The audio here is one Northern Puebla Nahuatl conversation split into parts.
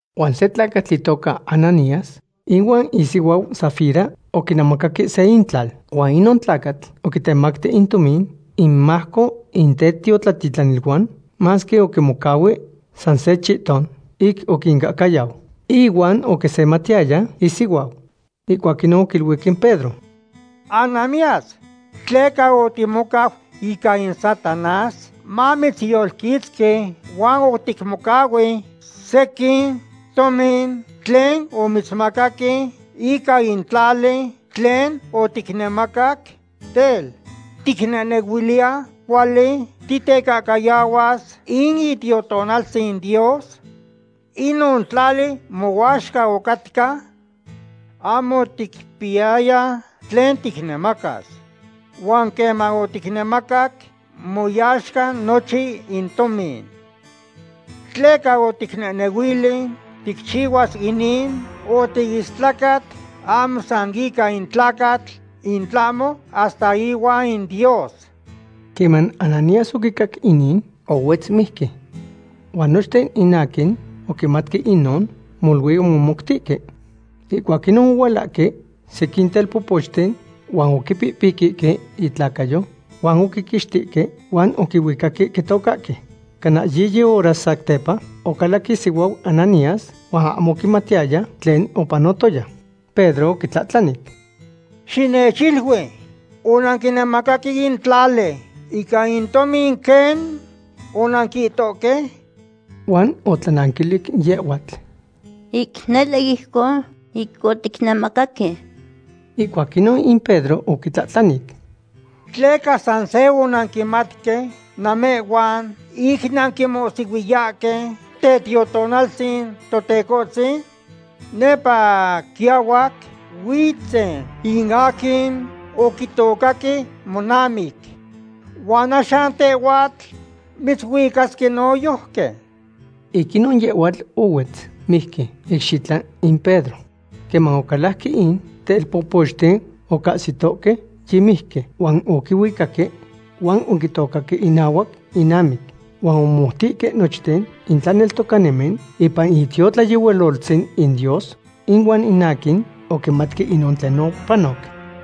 Huan se tlacatl itoca Ananías ihuan isihuau Safira oquinemacaque se intlal. Huan inon tlacatl oquitemacti in tomin inmajco in tetiotlatitlaniluan, masque oquimocahui sa se chihton ic oquincahcayau. Ihuan oquisematiyaya isihuau. Ihcuac inon oquiluic in Pedro: ―Ananías; ¿tleca otimocau ica in Satanás mamitzyolquitzqui huan oticmocahui sequin tomin tlen omitzmacaque ica in tlali tlen oticnemacac? Tel, ¿ticnehnehuiliya cuali titecahcayahuas in Itiotonaltzin Dios? Inon tlali mohuaxca ocatca. Ahmo oticpiyaya tlen ticnemacas. Huan queman oticnemacac, moyaxca nochin in tomin. ¿Tleca oticnehnehuili ticchihuas inin? Otiistlacat ahmo san ica in tlacatl, in tlahmo hasta ihuan in Dios. Queman Ananías oquicac inin, ohuetz mijqui. Huan nochten in aquin oquimatque inon, molui omomoutihque. Ihcuac inon ohualahque sequin telpopochten, huan oquipipiquihque itlacayo huan oquiquixtihque huan oquihuicaque quitocahque. Cana yiyi hora satepa, ocalac isihuau Ananías, huan ahmo oquimatiyaya tlen opanotoya. Pedro oquitlahtlanic: ―Xinechilui: ¿Onanquinemacaque in tlali ica in tomin quen onanquihtohque? Huan otlananquilic yehhuatl: ―Ic nele ijcon ic oticnemacaque. Ihcuac inon in Pedro oquitlahtlanic: ―¿Tleca san se onanquimatque namehhuan ic nanquimohsihuiyahque Tetiotonaltzin Totecohtzin? Nepa quiahuac huitzen in aquin oquitocaque monamic huan axan tehhuatl mitzuicasque noyojqui. Ic inon yehhuatl ohuetz mijqui icxitla in Pedro. Queman ocalajque in telpopochten ocahsitohque yimijqui, huan oquihuicaque huan oquitocaque inahuac inamic. Huan omomoutihque nochten in tlaneltocanimen ipan in itiotlayehualoltzin in Dios, ihuan in aquin oquimatque inon tlen opanoc.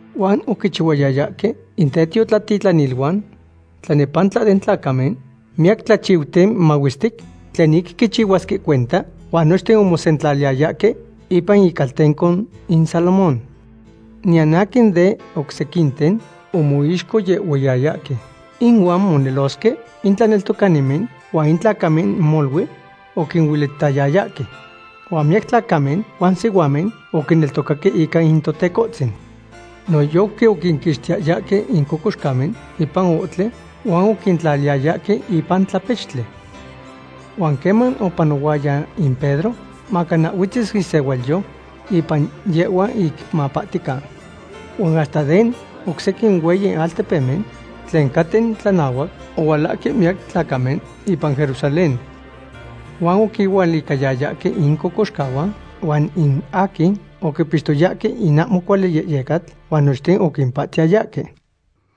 Huan oquichihuayayahque in tetiotlatitlaniluan tlanepantla den tlacamen miyac tlachiuten mahuestic tlen ic quichihuasque cuenta, huan nochten omosentlaliyayahque ipan Icaltenco in Salomón. Niyan aquin den oc sequinten omoixcohyehuiyayahque inuan monelosque in tlaneltocanimen huan in tlacamen molui oquinuelitayayahque. Huan miyac tlacamen huan sihuamen oquineltocaque ica in Totecohtzin. Noyojqui oquinquixtiyayahque in cocoxcamen ipan ohtli, huan oquintlaliyayahque ipan tlapechtli. Huan queman opanohuaya in Pedro, macana huetzis isehualyo ipan yehhuan ic mapahtican. Huan hasta den oc sequin hueyi altepemen tlen caten tlanahuac, ohualahque miyac tlacamen ipan Jerusalén. Huan oquinualicayayahque incocoxcahuan huan in aquin oquipixtoyahque in ahmo cuali yehyecatl, huan nochten opahtiyayahque.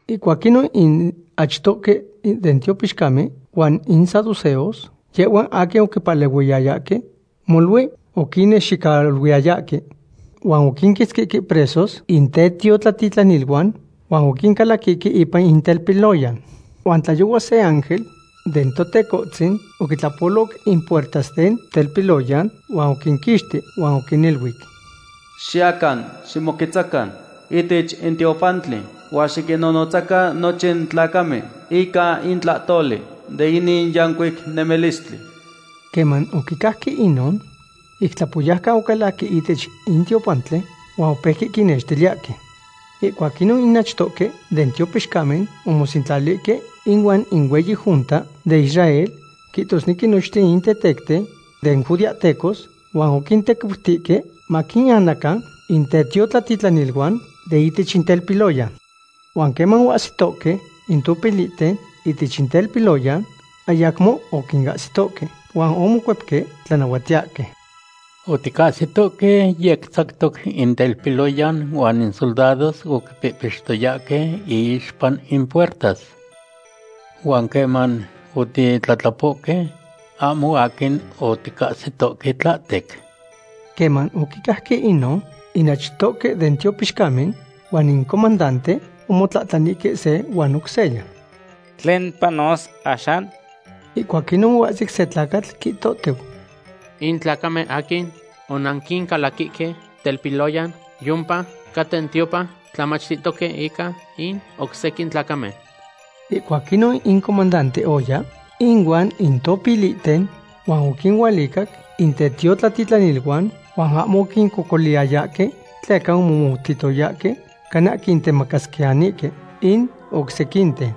Ihcuac inon in achtohque den tiopixcamen huan in saduceos, yehhuan aquin oquipalehuiyayahque, molui oquinnexicaluiyayahque. Huan oquinquitzquihque presos in tetiotlatitlaniluan, huan oquincalaquihque ipan in telpiloyan. Huan tlayohua se ángel den Totecohtzin oquintlapo in puertas den telpiloyan huan oquinquixti. Huan oquiniluic: ―Xiyacan ximoquetzacan ihtech in tiopantli huan xiquinnonotzacan nochin tlacamen ica in tlahtoli de inin yancuic nemilistli. Queman oquicajque inon, ic tlapoyaucan ocalajque ihtech in tiopantli huan opeuque quinextiliyahque. Ihcuac inon in achtohque den tiopixcamen omosentlalihque ihuan in hueyi junta den Israel, quihtosnequi nochin in tetecten den judeahtecos, huan oquintequiutihque maquinanacan in tetiotlatitlaniluan de ihtech in telpiloyan. Huan queman oahsitohque in topilihten ihtech in telpiloyan, ayacmo oquinahsitohque. Huan omocuepque tlanahuatiyahque: ―Oticahsitohque yec tzactoc in telpiloyan huan in soldados oquipihpixtoyahque iixpa in puertas, huan queman otitlatlapohque, ahmo aquin oticahsitohque tlahtec. Queman oquicajque inon, in achtoque den tiopixcamen huan in comandante omotlahtlanihque se huan oc seya: ―¿Tlen panos axan? Ihcuac inon oahsic se tlacatl quihtotiu: ―In tlacamen aquin onanquincalaquihque telpiloyan yiompa caten tiopan tlamachtihtoque ica in oc sequin tlacamen. Ihcuac inon in comandante oya ihuan in topilihten huan oquinualicac in tetiotlatitlaniluan, huan ahmo oquincocoliyayahque, tleca omomoutiyayahque cana quintemacasquiyanihque in oc sequinten.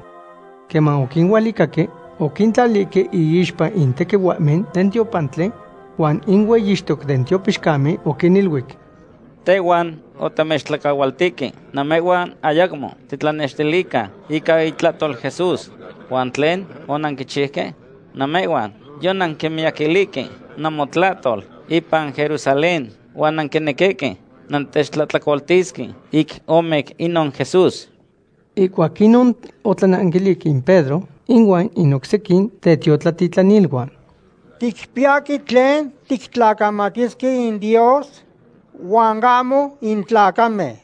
Queman oquinualicahque, oquintlalihque iixpa in tequihuahmen den tiopantli, huan in hueyixtoc den tiopixcamen oquiniluic: ―Tehhuan otamechtlacahualtihque namehhuan ayacmo xitlanextilican ica itlahtol Jesús. ¿Huan tlen onanquichiuque? Namehhuan yonanquimiyaquilihque namotlahtol ipan Jerusalén huan nanquinequihque nantechtlahtlacoltisque ic omic inon Jesús. Ihcuac inon otlananquilic in Pedro ihuan in oc sequin tetiotlatitlaniluan: ―Ticpiyahque tlen tictlacamatisque in Dios huan ahmo in tlacamen.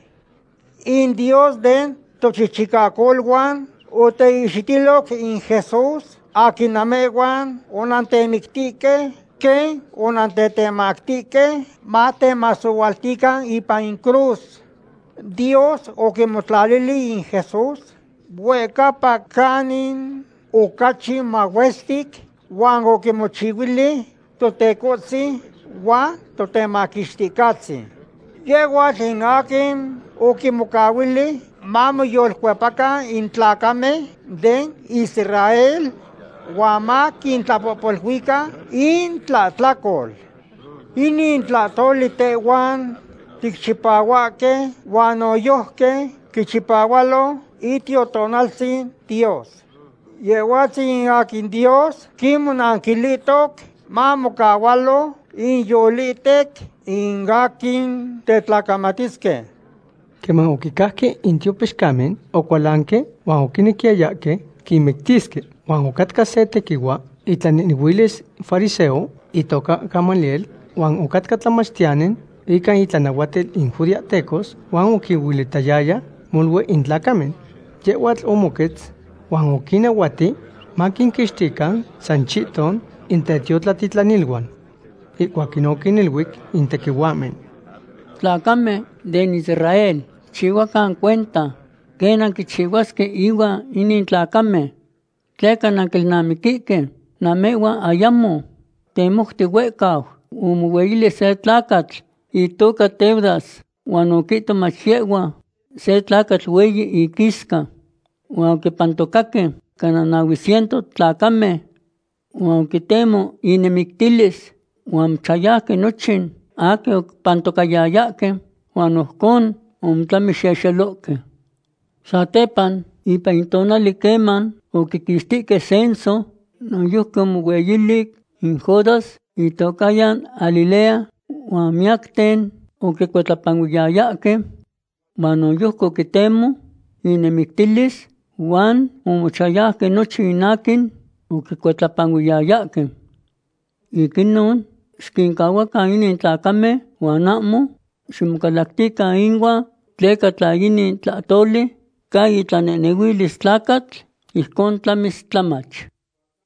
In Dios den tochichicacoluan oteihxitiloc in Jesús aquin namehhuan onantemictihque, quen onantetemactihque matemasohualtican ipan in cruz. Dios oquimotlalili in Jesús huehcapa canin ocachi mahuestic huan oquimochihuili Totecohtzin huan Totemaquixticahtzin. Yehhuatl in aquin oquinmocahuili mamoyolcuepacan in tlacamen den Israél huan maquintlapohpoluican intlahtlacol. Inin tlahtoli tehhuan ticchipahuahque huan noyojqui quichipahualo Itiotonaltzin Dios. Yehhuatzin in aquin Dios quinmomaquilihtoc mamocahualo inyolihtec in aquin tetlacamatisque. Queman oquicajque in tiopixcamen, ocualanque huan oquinequiyayahque quinmictisque. Huan ocatca se tequihua itlanehnehuilis fariseo itoca Gamaliel, huan ocatca tlamachtiyani ica itlanahuatil in judeahtecos. Huan oquihuelitayayahque molui in tlacamen. Yehhuatl omoquetz huan oquinahuati maquinquixtican san chihton in tetiotlatitlaniluan. Ihcuac inon oquiniluic in tequihuahmen: ―Tlacamen den Israel, xicchihuacan cuenta quen nanquichihuasque ihuan inin tlacamen. Tleca nanquilnamiquihque namehhuan ayamo temouti huehcau, omohueyili se tlacatl itoca Teudas huan oquihto mach yehhua se tlacatl hueyi iquisca. Huan oquipantocaque cana nahue ciento tlacamen. Huan oquitemo inemictilis huan omochayauque nochin aquin oquipantocayayahque huan ojcon omotlamixexelohque. Satepa, ipan in tonali queman oquiquixtihque censo, noyojqui omohueyili in Judas, itocahyan Galilea, huan miyacten oquicuitlapanuiyayahque, huan noyojqui oquitemo inemictilis huan omochachayauque nochin in aquin oquicuitlapanuiyayahque. Ic inon, xiquincahuacan inin tlacamen huan ahmo ximocalactican inuan, tleca tla inin tlahtoli ca itlanehnehuilis tlacatl, ijcon tlamis tlamach.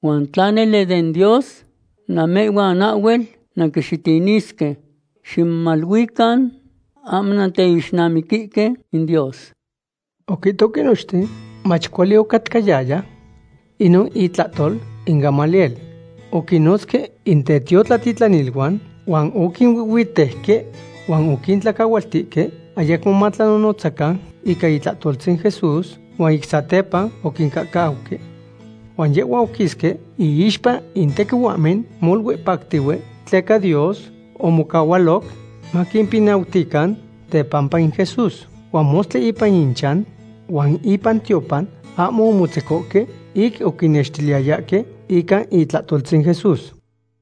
Huan tla nele den Dios, namehhuan ahhuel nanquixitinisque. Ximomaluican ahmo nanteixnamiquihque in Dios. Oquihtohque nochten mach cuali ocatcayaya inon itlahtol in Gamaliel. Oquinnotzque in tetiotlatitlaniluan huan oquinuihhuitejque huan oquintlacahualtihque ayacmo matlanonotzacan ica itlahtoltzin Jesús, huan ic satepa oquincahcauque. Huan yehhuan oquisque iixpa in tequihuahmen, molui pactihue tleca Dios omocahualoc maquimpinautican tepampa in Jesús. Huan mostli ipan inchan huan ipan tiopan ahmo omotzecohque ic oquinnextiliyayahque ica itlahtoltzin Jesús.